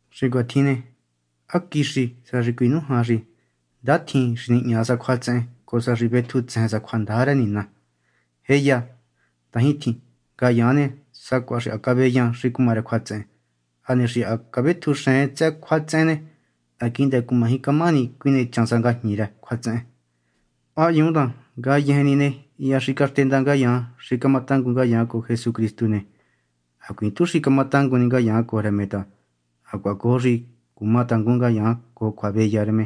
Xi cuatjin ne, ¿há quixi sa xi cuinújan xi ndatjin xi nihña sa cjuatsehen cojo sa xi vetjutsejen sa cjuandaja rë Nina? ¡Jéya, ndajintjin! Ngayaan ne, sacuaha xi caveyan xi cuma rë cjuatsehen. Hane xi ha cavetjuxen tsëhë cjuatsehen ne, ha quihndë cumaji camahani cuinechan sa ngajñi rë cjuatsehen. ¿Há hyuun ta ngayejen ni ne, hya xi caxtenda ngayaan xi cumatangun ngayaan cojo Jesucristu ne, hacuiin tu xi cuma tangun ni ngayaan cojo rë me ta hacuaha cojo xi cuma tangun ngayaan cojo cjuaveya rë me?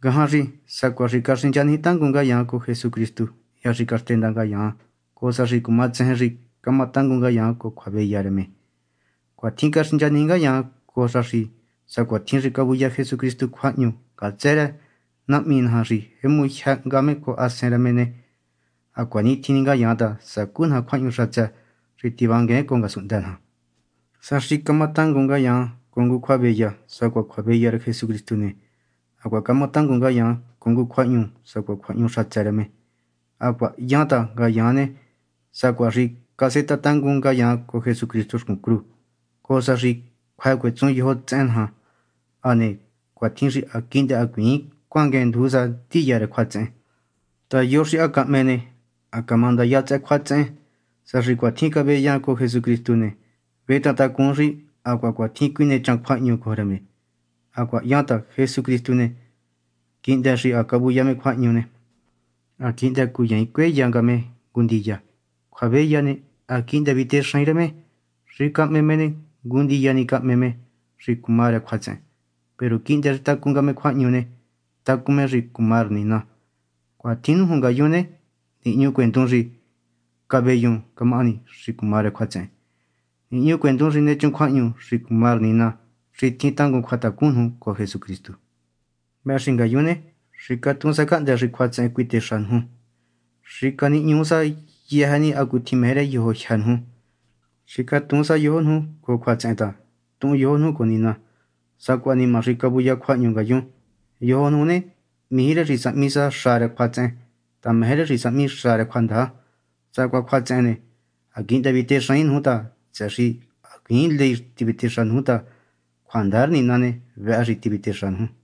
Ngajan xi sacuaha xi caxinchaniji tangun ngayaan cojo Jesucristu hya xi caxtenda ngayaan, cojo sa xi cuma tsejen xi camatangun ngayaan cojo cjuaveya rë me. Cuatjin caxinchaniji ngayaan cojo sa xi sacuatjin xi cavuya Jesucristu cjuahñu ngatsë rë Nahmi naja xi jemu jyë hnga me cojo Hasen rë me ne, hacuanitjin ni ngayaan ta sacú naja cjuahñu xatsë xi tivanguen cojo ngasunhndë naja. Sa xi camatangun ngayaan cojo ngu cjuaveya sacuaha cjuaveya rë Jesucristu ne, hacuaha cama tangun ngayaan cojo ngu cjuahñu sacuaha cjuahñu xatsë rë me. Hacuaha hyan ta ngayaan ne, sacuaha xi casetaha tangun ngayaan cojo Jesucristu xcun cru, cojo sa xi cjuë cuetsun yojo tsehen naja, hane cuatjin xi ha quihndë hacuiin cuanguen nduju sa ndiya rë cjuatsehen. Ta yo xi ha cahme ne, ha camandaya tsëhë cjuatsehen. Sa xi cuatjin caveyan cojo Jesucristu ne, vetahantacun xi hacuaha cuatjin cuinechan cjuahñu cojo rë me. Hacuaha hyan ta Jesucristu ne, quihndë xi ha cavuya me cjuahñu ne, ha quihndë cuyaain cueya nga me ngu ndiya. Cjuaveya ne, ha quihndë vitexaain rë me. Xi cahme me ne, ngu ndiya ni cahme me xi cuma rë cjuatsehen; peru quihndë xi tacun nga me cjuahñu ne, tacun me xi cuma rë Nina. Cuatjin nuju ngayun ne, nihñucuendun ni xi caveyun camahani xi cuma rë cjuatsehen, nihñucuendun xi nechun cjuahñu xi cuma rë Nina xi tjin tangun cjuatacun nuju cojo Jesucristu. Vëhë xi ngayun ne, xicatuun sa cahndë xi cjuatsehen cuitexa nuju; xicanihñuu sa yëjë ni hacutjin meje rë yojo jyë́ nuju. Xicatuun sa yojo nuju cojo cjuatsehen ta tuhun yojo nuju cojo Nina, sacuaha nima xi cavuya cjuahñu ngayun. Yojo nuju ne, mijí rë xi sahmi xa rë cjuatsehen ta meje rë xi sahmi xa rë cjuandaja. Sacuaha cjuatsehen ne, ha quihndë vitexaain nuju ta, tsëhë xi hacuiin ley tivitexa nuju ta cjuandaja rë Nina ne, vëhë tivitexa nuju.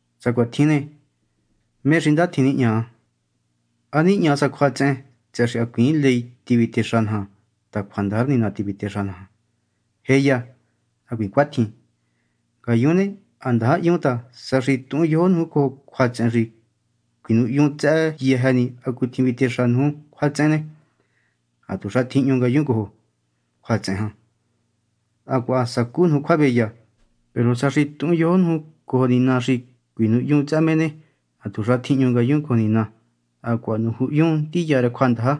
Sa cuatjin ne, ¿mé xi ndatjin nihña? ¿Há nihña sa cjuatsehen tsëhë xi hacuiin ley tivitexa naja ta cjuandaja rë Nina tivitexa naja? ¡Jéya, hacuiin cuatjin! Ngayun ne, ha ndaja hyun ta sa xi tuhun yojo nuju cojo cjuatsehen xi cuinuhyun tsëhë yëjë ni hacutjin vitexa nuju cjuatsehen ne, hatuxa tjihñu ngayun cojo cjuatsehen jan, hacuaha sacú nuju cjuaveya. Peru sa xi tuhun yojo nuju cojo Nina xi cuinuhyun tsëhë me ne, hatuxa tjihñu ngayun cojo Nina, hacuaha nujyuhunyun ndiya rë cjuandaja.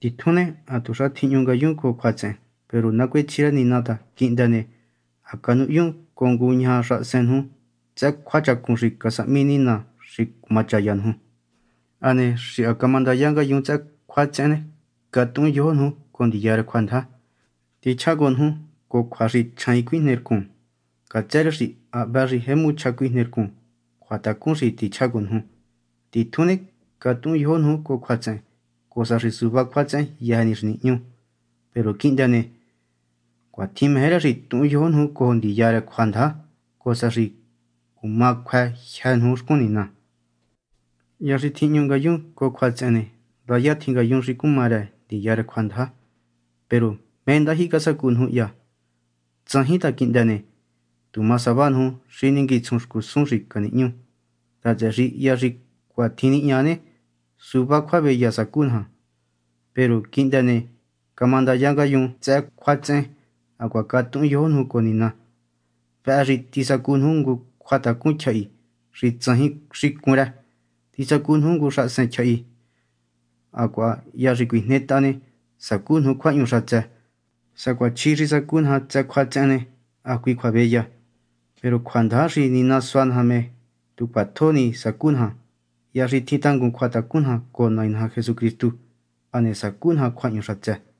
Titjun ne, hatuxa tjihñu ngayun cojo cjuatsehen. Peru nacuechji rë Nina ta quihndë ne, ha canuhyun cojo ngu ñaja xahasen nuju tsëhë cjuachacun xi casahmi Nina xi camachaya nuju. Hane xi ha camandaya ngayun tsëhë cjuatsehen ne, catuhun yojo nuju cojo ndiya rë cjuandaja. Tichjá cojo nuju cojo cjua xi chjaain cuijne rcun, ngatsë rë xi hvë xi jemu chja cuijne rcun cjuatacun xi tichjá cojo nuju. Titjun ne, catuhun yojo nuju cojo cjuatsehen, cojo sa xi suvá cjuatsehen yëjë ni xi nihñu. Peru quihndë ne, cuatjin meje rë xi tuhun yojo nuju cojo ndiya rë cjuandaja cojo sa xi cuma cjuë jyë́ nuju xcun Nina. Hya xi tjihñu ngayun cojo cjuatsehen ne, ndaya tjin ngayun xi cuma rë ndiya rë cjuandaja. Peru ¿mé ndajyihi casacu nuju hya? Tsajin, ta quihndë ne, tu ma sava nuju xi ninguitsjun xcusun xi canihñu ta, tsëhë xi hya xi cuatjin nihña ne, suvá cjuaveya sacu naja. Peru quihndë ne, camandaya ngayun tsëhë cjuatsehen hacuaha catuhun yojo nuju cojo Nina. Vëhë xi tisacu nuju ngu cjuatacun tyjahi xi tsajin cun rë, tisacu nuju ngu xahasen tyjahi, hacuaha hya xi cuijnetaha ne, sacú nuju ngu cjuahñu xatsë. Sacuaha chjí xi sacu naja tsëhë cjuatsehen ne, hacui cjuaveya. Peru cjuandaja xi Nina sua naja me, tu cjuatjo ni sacu naja hya xi tjin tangun cjuatacun naja cojo Nai naja Jesucristu. Hane sacu naja cjuahñu xatsë.